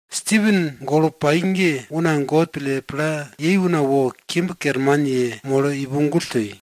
Stipen golo pai ge una God pille pla yei una wo kimb kerman yemolo ipo gull toi.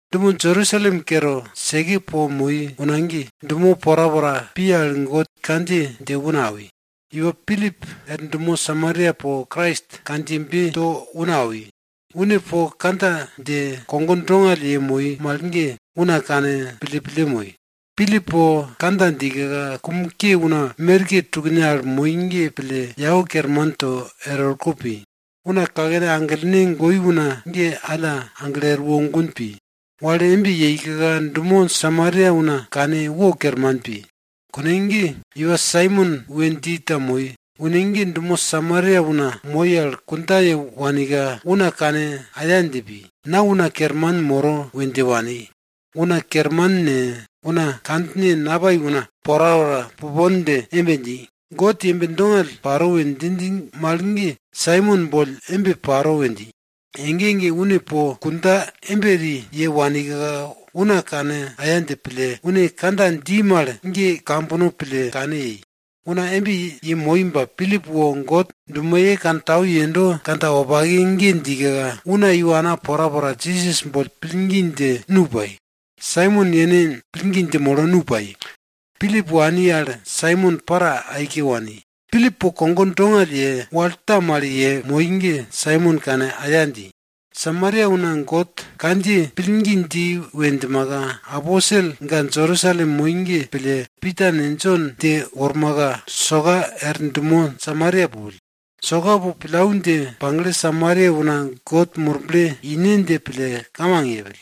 Dumo Jerusalem kere seke po moi una ge, dumo porapora pi al God kandjiye dje una awi. Iwa Pilip er dumo Samaria po Krais kandjiyebe to una awi. Une po kandja dje, kogo dongall yemoi mal ge, una kane pille pille moi. Pilip po kandja djika, kum ke una merke tukne al moi ge pille yau kerman to er orko pi. Una kakene aglene goi una ge alla aglo erwo gun pi. Wal embe yeika dumo Samaria una kane wo kerman pi. Kune ge iwa Saimon we dji ta moi. Une ge dumo Samaria una moi al kundja ye wanika, una kane aya dje pi. Na una kerman moro we dje wani. Una kerman ne, una kandjine napai una porapora pupon dje embe dji, God yembe dongall paro we djinj mal ge Saimon boll embe paro we dji. Ege ege une po kundja embe eri ye wanika, una kane aya dje pille, une kandja dji mal ge kambono pille kane yei. Una embe yemoi ba Pilip wo God dumoye wopake kantau yendo kandja wopake ge djika, una iwana porapora Jisas boll pillgi dje, nu pai. Saimon yene pillgi dje molo, nu pai. Pilip wani al Saimon para aike wani. Pilip po kogo dongall ye, wal ta mal yemoi ge Saimon kane aya dji. Samaria una God kandjiye pillgi dji we djimaka, aposel ga Jerusalem moi ge pille, Pita ne, Jon dje wormaka, soka er dumo Samaria pupill. Soka po pillau dje pagle Samaria una God Murble ine dje pille kamang yepill.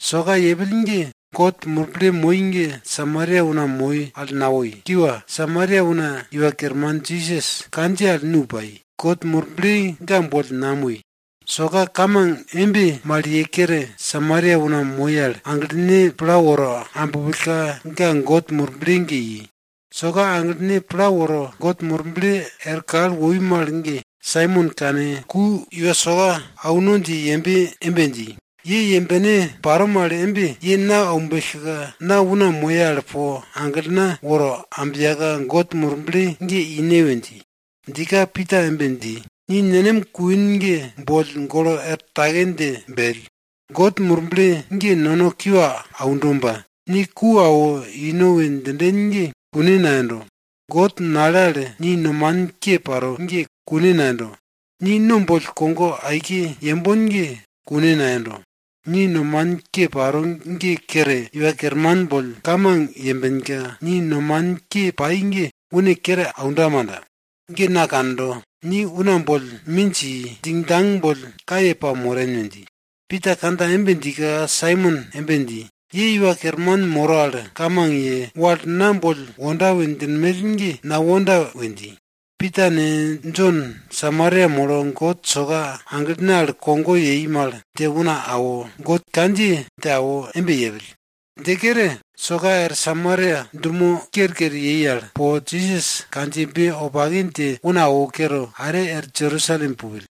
Soka yepill ge, God Murble moi ge Samaria una moi al nawoi. Kiwa, Samaria una Iwa Kerman Jisas kandjiye al nu pai God Murble ga boll namoi. Soka kamang embe mal ye kere, Samaria una moi al aglene pla woro abpillka, ga God Murble ge i. Soka aglene pla woro God Murble er kal woi mal ge, Saimon kane ku iwa soka auno dje ye embe dji, ye yembene paro mal embe ye na aumbellka, na una moye al po aglena woro ambiyaka, God Murble ge ine we dji. Djika, Pita embe dji, ni nenem kuin ge boll golo er take dje bell! God Murble ge nono kiwa aundo ba, ni ku awo ino we djinden ge kune nayendo. God nale al ni nomanin ke paro ge kune nayendo. Ni no boll kogo aike yembon ge kune nayendo. Ni nomanin ke paro ge kere, Iwa Kerman boll kamang yembenka, ni nomanin ke pai ge une kere aunda manda. Ge na kando, ni una boll minj i, djingdjang boll kaye pamoren we dji. Pita kandja embe djika, Saimon embe dji, ye Iwa Kerman moro al kamang ye, wal na boll wonda we djinmell ge nawonda we dji. Pita ne, Jon Samaria molo God soka aglene al kogo yei mal dje una awo, God kandjiye dje awo embe yepill. Dje kere, soka er Samaria dumo kerker yei al po Jisas kandjiyebe wopake dje una awo kere, are er Jerusalem pupill.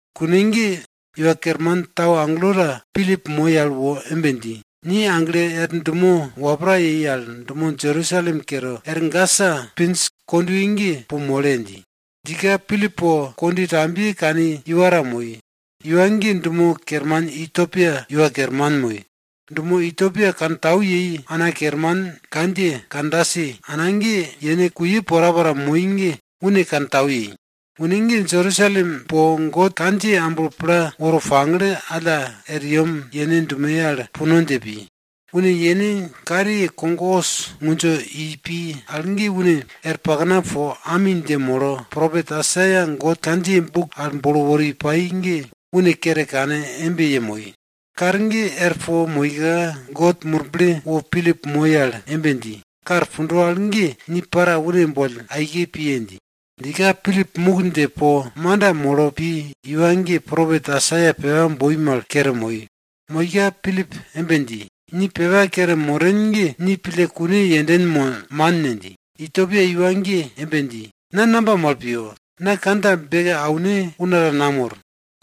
Kune ge Iwa Kerman tau agelo ta Pilip moi al wo embe dji, ni aglo er dumo wapra yero al dumo Jerusalem kere er Gasa pinj kondwe ge, po mole! dji. Djika, Pilip po kondwe tambiye kani iwa ta moi. Iwa ge dumo kerman Ityopia iwa kerman moi. Dumo Ityopia kantau yei ana kerman kandjiye Kandasi ana ge, yene kuye porapora moi ge une kantau yei. Une ge Jerusalem po God kandjiye amblo pla woro pagle, alla er yem yene dumoye al puno dje pi. Une yene kariye kog os ngundjo ipi al ge, une er pakna po ami dje molo propet Aisaia God kandjiye buk al bolo wori pai ge une kere kane embe yemoi. Kar ge er po pa moika, God Murble wo Pilip moi al embe dji, kar pundo al ge, ni piye! dji. Djika Pilip muk dje po manda molo pi, iwa ge propet Aisaia pepa boi mal kere moi. Moika Pilip embe dji, ni pepa kere moren ge ni pille kune yenden mo man ne? dji. Ityopia iwa ge embe dji, na namba mal piyo? Na kandja beke aune una ta namor.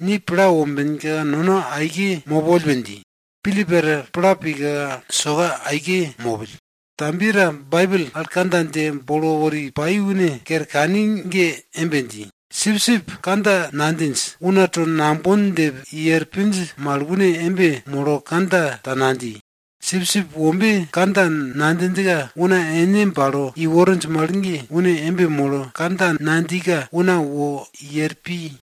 Ni pla wombenka nono aike mopoll we dji. Pilip er pla pika soka aike mopill. Tambiye ta Baibel al kandja dje bolo wori pai une kere kani ge embe dji, Sipsip kandja nadjinj, una to nambon dje i er pinj mal une embe molo kandja ta nadji. Sipsip wombe kandja nadjinjka una ene bale iworinj mal ge, une embe molo kandja nadjika una wo i er pi.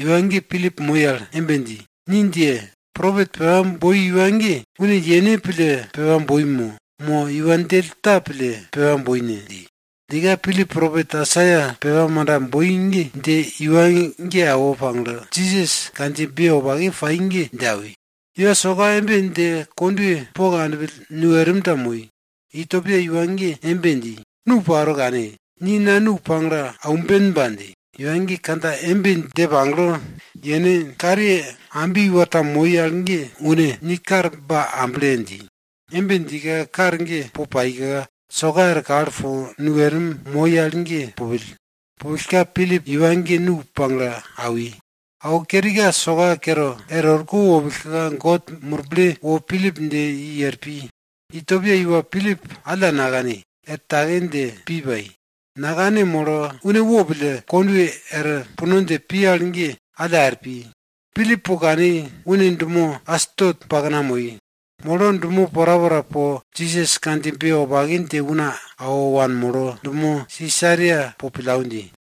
Iwa ge Pilip moi al embe dji, ni djiye! Propet pepa boi iwa ge, une yene pille pepa boi mo, mo iwa djell ta pille pepa boi ne? dji. Djika Pilip propet Aisaia pepa manda boi ge dje iwa ge awo pagle, Jisas kandjiyebe wopake pai ge dje awi. Iwa soka embe dje kondwe po kanpill, nu erim ta moi. Ityopia iwa ge embe dji, nu paro, kane! Ni na nu pagle aumbenba! dji. Iwa ge kandja embe dje pagle, yene kariye ambi iwa ta moi al ge une, ni kar ba able! dji. Embe djika kar ge po paika, soka er kal po nu erim moi al ge pupill. Pupillka, Pilip iwa ge nu pagle awi. Awo kerika soka kere er orko wopillka, God Murble wo Pilip dje i er pi. Ityopia iwa Pilip alla nakani, er take dje pi pai. Nakane molo, une wopille kondwe er puno dje pi al ge alla er pi. Pilip po kani, une dumo Asdot pakna moi. Molo dumo porapora po Jisas kandjiyebe wopake dje una awo wanmolo, dumo Sisaria po pillau dji.